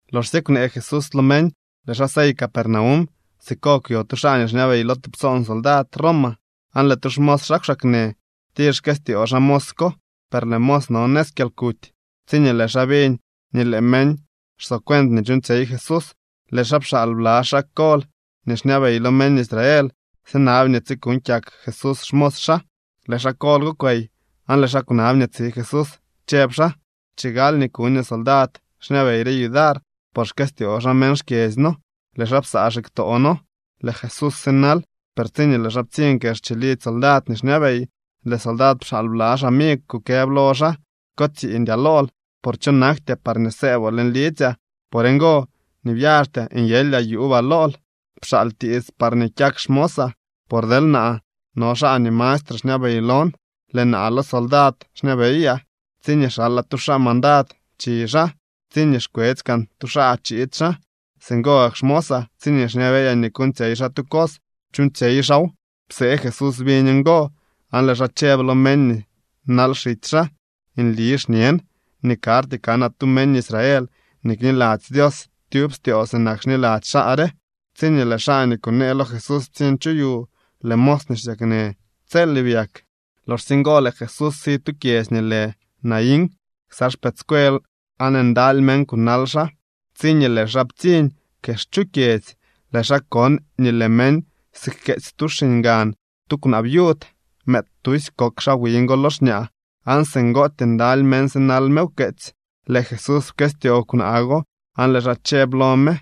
Loxsye kwnee Jesús lo meñ, lëë xaa sey Capernaum. Siko kwyo tu xaa nii xñabey lo tubtsoon soldad Roma, aan lëë tu xmos xaa kwxaaknë. Tir xkëstyoo xaa mos ko, per lëë mos no nëz kyalkuty. Tsiñee lëë xaa biñ nii lëë meñ xsocuent nii chuuñtsyey Jesús, lëë xaa pxaal bla xaa kol nii xñabey lo meñ Israel sinab nii tsikuuñ kyak Jesús xmos xaa. Lëë xaa kol go kwey aan lëë xaa kwnab nii tsi Jesús, chëb xaa: —Chigal nii kuñoo soldad xñabey re yudar, por xkëstyoo xaa meñ xkyedzy noo. Lëë xaa psaa xiktoo noo. Lëë Jesús sinal, per tsiñee lëë xaa ptsiñ kex chilidzy soldad nii xñabey, lëë soldad pxaal bla xamigw kukëb lo xaa: —Ko tsiiñdyaa lool, por cho naktyaa parñee sëëboo leñ lidzyaa. Por ngo nii byaxtyaa nyelyaa yuubaa lool. Pxaal tiits parñee kyak xmosaa. Por deel naa no xaa nii mastre xñabey lon, lëë naa lo soldad xñabeyaa. Tsiñee xalaa tu xaa mandad chi xaa. Tsiñee xkwetsy kaan tu xaa chiid xaa. Singo gak xmosaa tsiñee xñabeyaa nii kuuñtsyey xaa tu cos, chuuñtsyey xaaw. Psee Jesús biñ ngo, aan lëë xaa chëb lo meñ nii nal xitsy xaa: —Nli xñen nii karty kanaa tu meñ Israel nii kniladzy Dios tyub styoo sinak xniladzy xaa re. Tsiñee lëë xaa nii kunee lo Jesús ptsiñ chu yu, lëë mos nii xsyaknë tselye byak. Loxsye ngo lëë Jesús si tu kyedzy nii lë Naín ksa xpëëdscuel aan ndaly meñ kunal xaa. Tsiñee lëë xaa ptsiñ kex chu kyedzy, lëë xaa kon nii lëë meñ sijkeetsy tu xiñgan tu kwnaa viud. Mëëd tusy kok xaa wiñ go lo xñaa, aan singootyee ndaly meñ sinal me wkeetsy. Lëë Jesús pkëstyoo kwnaa go aan lëë xaa chëb lo me: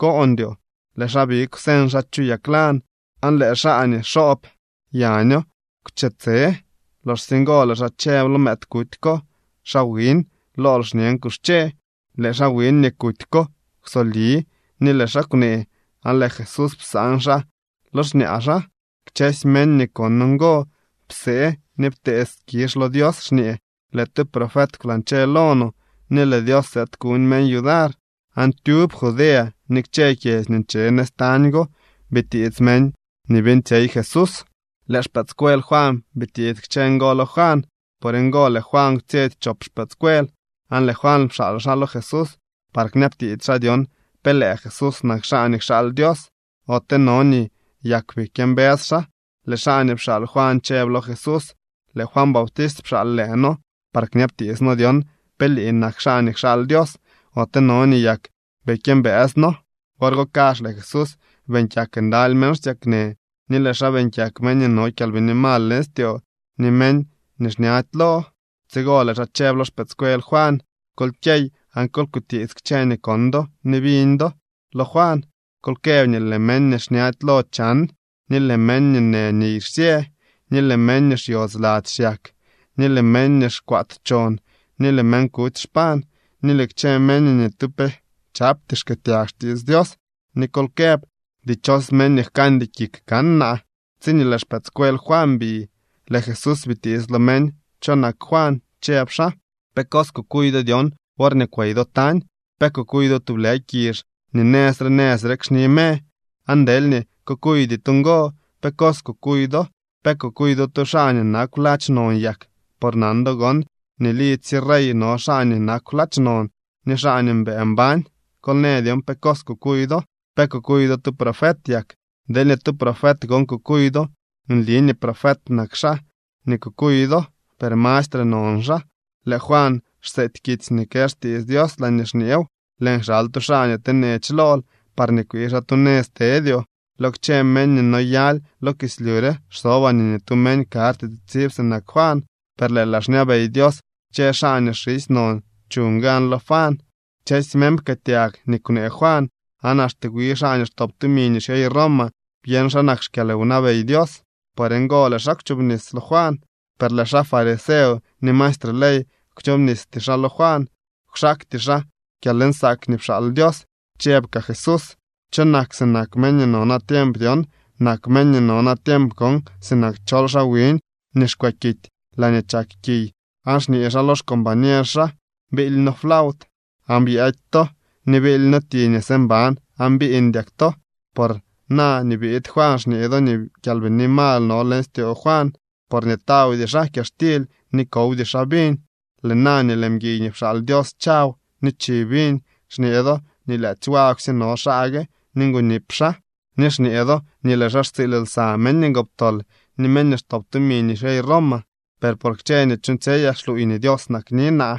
—Koondyoo. Lëë xaa big kwseñ xaa chu yaglan, aan lëë xaa nii nxob yaño kwche tse. Loxsye ngo lëë xaa chëb lo mëëd kuty ko: —Xaa wiñ, lool xñen, ¡kuxche! Lëë xaa wiñ nii kuty ko kwsobli ni lëë xaa kwnee, aan lëë Jesús psaan xaa lo xñaa xaa. Kchësy meñ nii kon ngo psee ni ptee skizh lo Dios, xñee: —Lëë tu profet kwlañche lo no, ni lëë Dios sëëd kuñ meñ yudar. Aan tyub Judea ni kchë kyedzy nii nche nëz tañ go bitiits meñ nii beeñtsyey Jesús. Lëë xpëëdscuel Juan bitiits kchë ngo lo Juan. Por ngo lëë Juan kwtsyetsy chop xpëëdscuel, aan lëë Juan pxaal xaa lo Jesús par kñabtiits xaa dyon pe lëë Jesús nak xaa nii kxaal Dios, ote no nii yak bii kyëmbës xaa. Lëë xaa nii pxaal Juan chëb lo Jesús: —Lëë Juan Bautist pxaal lëë noo par kñabtiits noo dyon pe lii nak xaa nii kxaal Dios, ote no nii yak bii kyëmbëës noo. Wor go kazh lëë Jesús beeñ kyak ndaly meñ xsyaknë ni lëë xaa beeñ kyak meñ nii no kyalbini mal leñ styoo ni meñ nii xñady lo. Tsigo lëë xaa chëb lo xpëëdscuel Juan: —Kol kyey, aan kol kutiits kchë nii kon do ni biñ do lo Juan. Kol këb nii lëë meñ nii xñady lo chan, ni lëë meñ nii në niy xsyë, ni lëë meñ nii xyodz lady xyak, ni lëë meñ nii xkwaat chon, ni lëë meñ kuty xpañ, ni lëë kchë meñ nii ni tu pe chapty xkëëtyag xtiits Dios. Ni kol këb: Dichos meñ nii jkandy kik kan naa. Tsiñee lëë xpëëdscuel Juan bi, lëë Jesús bitiits lo meñ cho nak Juan, chëb xaa: —¿Pe cos kukuy do dyon worñee kwey do tañ? ¿Pe kukuy do tublë kizh nii nëz re nëz rek xni me? Aan deelñee kukuydy to ngo, ¿pe cos kukuy do? ¿Pe kukuy do tu xaa nii nakw ladx non yak? Por nan do gon nii lidzy sye rey no xaa nii nakw ladx non ni xaa nii mbëë mbañ. Kol në dyon pe cos kukuy do. ¿Pe kukuy do tu profet yak? Deelñee tu profet gon kukuy do, nli nii profet nak xaa nii kukuy do, per mastre non xaa. Lëë Juan xseety kitsy nii kë xtiits Dios laañee xñeew: Lëën kxal tu xaa nii tenech lool, parñee kwii xaa tu nëz tedyoo. Lo kchë meñ nii noyaly lo kislyu re xsobaa nii ni tu meñ karty tsitsib sinak Juan. Per lëë laa xñabey Dios kchë xaa nii xisy non chuñ gan lo Juan. Kchësy meñ pkëëtyag nii kwnee Juan aan axte wi xaa nii xtop tumi nii xyey Roma byeñ xa nak xkyalwnabey Dios. Por ngo lëë xaa kwchobnis lo Juan. Per lëë xaa fariseo ni maestre ley kwchobnisty xaa lo Juan. Kwxaakty xaa kyalnsaak nii pxaal Dios. Chëb kaa Jesús: —¿Cho nak sinak meñ nii no natiemp dyon? Nak meñ nii no natiemp gon sinak chol xaa wiñ nii xkwe kity laañee chak kiy aan xñee xaa lo xcombañer xaa: “Biily noo flaut aan byëëdy to, ni biily noo ti nii së mban aan biiñdyak to.” Por na nii biid Juan xñee do nii kyalbini mal no leñ styoo xaa, porñee tawdy xaa kyaxtily ni kowdy xaa viñ. Lëë na nii lëë mguiy nii pxaal Dios chaw ni chi viñ, xñee do nii lyaadzy wagwsye no xaa gue ni ngonip xaa, ni xñee do nii lëë xaa xtsiil lsa meñ ngoptol ni meñ nii xtop tumi nii xyey Roma. Per por kchë nii chuuñtsyeyaa xluuy nii Dios nakni naa.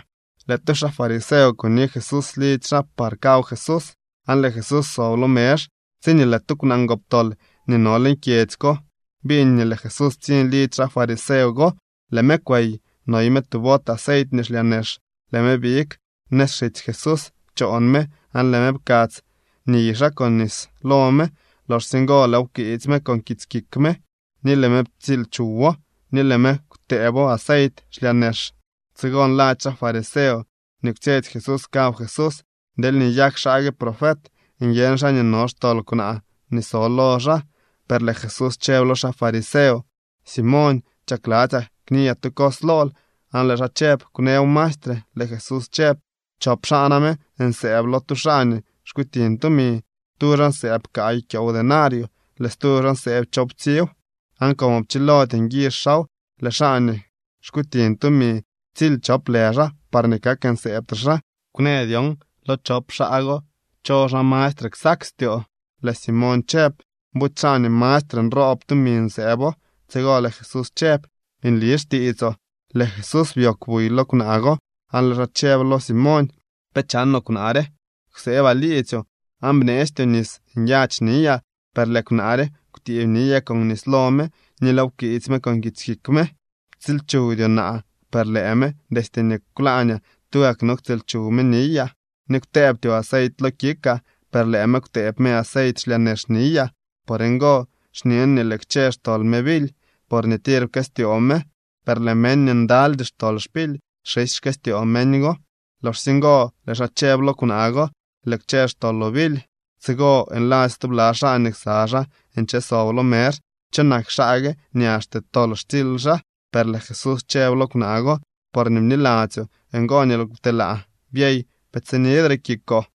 Lëë tu xaa fariseo kuni Jesús lidzy xaa par kaw Jesús, aan lëë Jesús sob lo mezh. Tsiñee lëë tu kwnaa ngoptol nii no leñ kyedzy ko biñ nii lëë Jesús ptsiñ lidzy xaa fariseo go, lëë me kwey noy me tu bot aceit nii xlyaa nex. Lëë me big nëz xitsy Jesús choon me aan lëë me pkadz niy xaa con nis lo me. Loxsye ngo lëëw pkwiitsy me con kits kik me, ni lëë me ptsiil chuwo, ni lëë me kwtëëbo aceit xlyaa nex. Tsigo nladzy xaa fariseo nii kwtsyetsy Jesús kaw Jesús: “Deelñee nyak xaa gue profet, nyeñ xaa nii no xtol kwnaa nii so lo xaa.” Per lëë Jesús chëb lo xaa fariseo: —Simoñ, chakladzyaa kniyaa tu cos lool. Aan lëë xaa chëb: —Kwnëw maestre. Lëë Jesús chëb: —Chop xaa name nsëëb lo tu xaa nii xkutiñ tumi. Tu xaa nsëëb kaay kyoow denario. Lëë stu xaa nsëëb choowptsiiw. Aan como pchilody nguizh xaaw, lëë xaa nii xkutiñ tumi ptsily chop lë xaa parñee kak nsëëbtre xaa. Kwnë dyon lo chop xaa go cho xaa mastre ksak styoo. Lëë Simoñ chëb: —Buty xaa nii mastre nroob tumi nsëëbo. Tsigo lëë Jesús chëb: —Nli xtiitsoo. Lëë Jesús byoogw buy lo kwnaa go, aan lëë xaa chëb lo Simoñ: —¿Pe chanoo kwnaa re? Kwsëbaa liidzyoo, aan bneestyoo nis nyadx niyaa. Per lëë kwnaa re kwtiib niyaa con nis lo me, ni lëëw pkwiitsy me con kits kik me. Ptsiilchuwdyoo naa, per lëë me, destye kwlaañaa, tugak no ktsiil chuw me niyaa. Ni kwtëëbtyoo aceit lo kikaa, per lëë me kwtëëb me aceit xlyaa nex niyaa. Por ngo xñen nii lëë kchë xtol me bily, porñee tir pkëstyoo me. Per lëë meñ nii ndalydy xtol xpily, xisy xkëstyoo meñ go. Loxsye ngo lëë xaa chëb lo kwnaa go: —Lëë kchë xtoloo bily. Tsigo nladzy stubla xaa nii ksa xaa nche sob lo mezh: —¿Cho nak xaa gue nii axte tol xtsily xaa? Per lëë Jesús chëb lo kwnaa go: —Porñee bniladzyoo, ngo nii lëël kwtelaa. Byey, pe tsinidre kikoo.